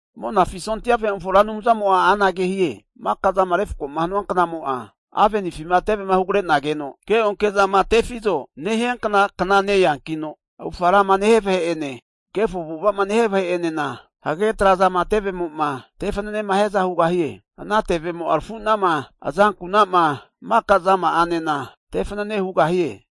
Monafi sondia vahe'mofo Ra Anumzamo'a anage hie, maka'zama refkoma hanua knamo'a, avenifima tevema hugre'nageno keonke zama tefizo nehiankna kna neankino, avufga rama nehia vahe'ene, kefo avu'ava'ma nehia vahe'enena, hagage trazama tevemo'ma tefanenema hiaza hugahie. Ana tevemo'a arafunama, azankuna'ma, maka'zama 'anena tefanane hugahie.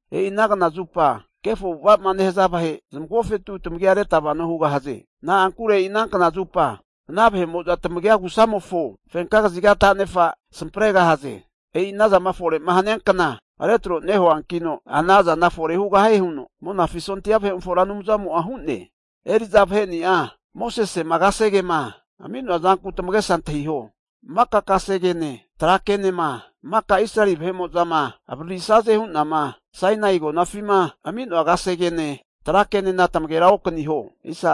E'i ana knazupa kefo avu'ava'ma nehaza vahe zamagofetu tamagia reta vano hugahaze. Na'ankure e'i ana kna zupa ana vahe'mo'za tamagia agu'samofo fenka kaziga tanefa samparegahaze. E'i anazama fore'ma hania kna retro nehuankino ana zana fore hugahie huno Monafi sondia vahe'mofo Ra Anumzamo'a hu'ne. Eri'za vaheni'a Mosesema kasegema ami'noa zanku tamagesa antahiho. Maka kasegene tra kenema maka Israeli vahe'mo'zama avaririsaze hu'nama Sainai (Horep) agonafima ami'noa kasegene tra kenena tamagera okaniho.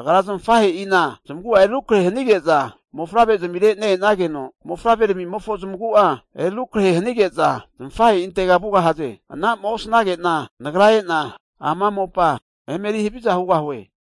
Agra zamafahe'ina zamagu'a eri rukrahe hanige'za mofavrezmire ne-enageno, mofavreramimofo zamagu'a eri arukrahe hanige'za zamafahe'intega vugahaze. Anama osnage'na Nagra e'na ama mopa emeri haviza hugahue.